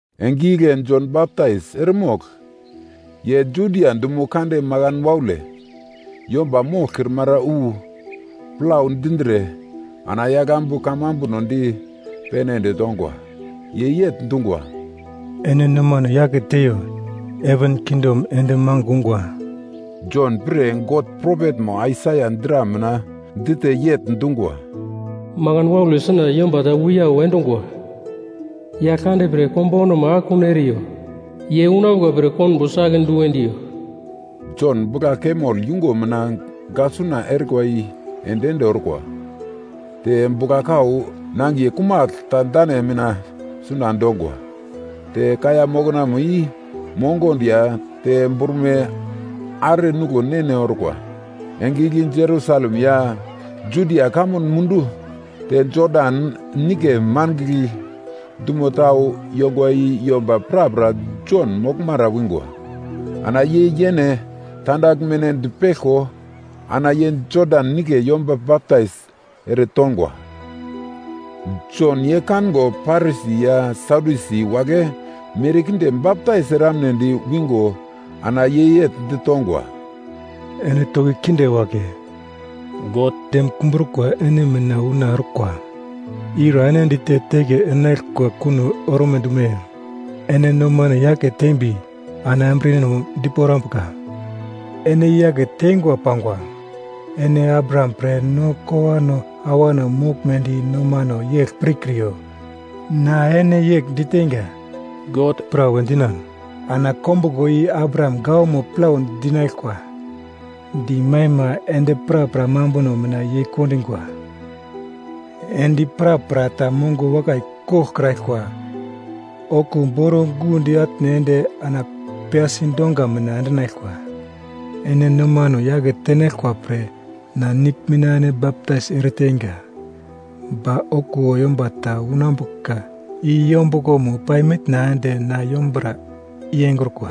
Enge igle Jon Baptais eremogl, ye Judia dumo kande makan waule, yomba moglkrimara wu, plau dindre ana yaglambu kamambuno di pene ende tongwa. Ye yegl dungwa, “Ene nomano yake teiyo. Heven kingdom ende magl ungwa.” Jon pre God propetmo Aisaia dra mina dite yegl dungwa: “Makan waule suna yomba ta wiyau endungwa, ‘Yaglkande pre konbaunamo akekun eriyo. Ye unambuka pre konbo si-ake du endiyo.’” Jon bugla-kamel yungo mina gaglsuna erikwa i ende-ende orkwa. Te bugla-kau nangiye kumagl ta dane mina suna dongwa. Te kaiya moknamo i mongondo ya te brume are nuglo ne-ne orkwa. Enge igle Jerusalem ya Judia kamun mundu te Jodan Nigle mangigl dumo tau yongwa i yomba prapra Jon moglmara wingwa. Ana ye yene tandaglmeno dipeglko, ana ye Jodan Nigle yomba baptais eretongwa. Jon ye kango Parisi ya Sadyusi wagle merkinde baptais eramnedi wingo ana ye yegl ditongwa, “Ene toki kinde wagle, God dem kumbrukwa ene mina una orkwa. Ira ene dite teke enaglkwa kuno orme dume? Ene nomano yake tembi, ana embriyeno diporambuka, ene i-yake tengwa pangwa. Ene Abraham pre no kowano awano moglmedi nomano yegl pirkriyo. Na ene yegl diteinga, God pra we dinan ana kombuglo i Abraham gawamo plau dinaglkwa. Dimaima endi prapra mambuno mina yeikondungwa. Endi prapra ta mongo wakai koglkraglkwa okuwo boro-gundi atne ende ana piyasi donga mina endinaglkwa. “Ene nomano yake tenaglkwa pre, na nigl mina ene baptais ereteinga. Ba okuwo yomba ta unambuka i yombuglomo pai mitna ende na yombura i engrukwa.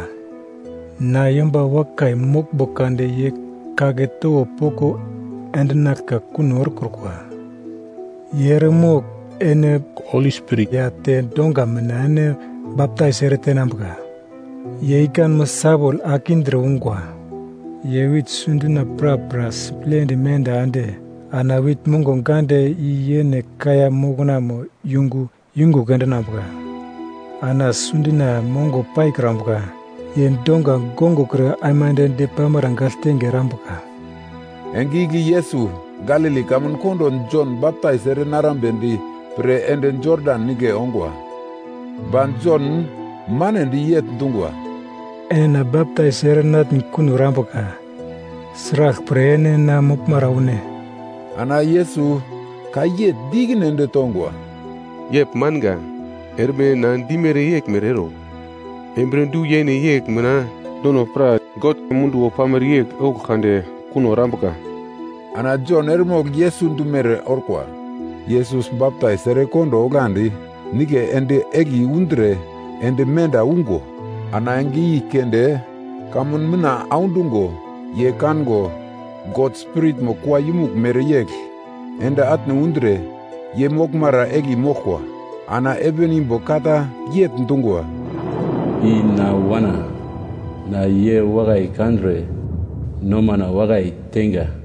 Na yomba wakai moglmbo kade ye kagle towo poko yendenaglka kuno erekrukwa. Ye eremogl ene Holi Spirit ya te donga mina ene baptais ere tenambuka. Ye ikanmo sawol ake indre ungwa. Ye wit sundina prapra siplendi menda ende ana wit mongo gande i yene kaiya moknamo yungu yungugl endinambuka. Ana sundina mongo paikrambuka ye donga gongokre aimande depamara gagltenge erambuka.” Enge igle Yesus Galili kamun kondo Jon baptais ere narambedi pre ende Jodan Nigle ongwa. Ba Jon manedi yegl dungwa, “Ene na baptais ere natn kuno erambuka. Sraglpre ene na moglmara une?” Ana Yesus ka yegl di ikine ende tongwa, “Yegl manga, erme na dimere yeglmere ero. Embriye du-yene yegl mina nono pra God munduwo pamere yegl ouglo kade kuno erambuka.” Ana Jon eremogl Yesus dumere orkwa. Yesus baptais erekondo oglandi, nigle ende egli undre ende menda ungo. Ana enge i keunde kamun mitna audungo, ye kango God Spiritmo kua yumugl mereyegl ende atne undre ye moglmara egli moglkwa. Ana heven imbo ka ta yegl dungwa, “I na Wana, na ye wakai kandre nomana wakai teinga.”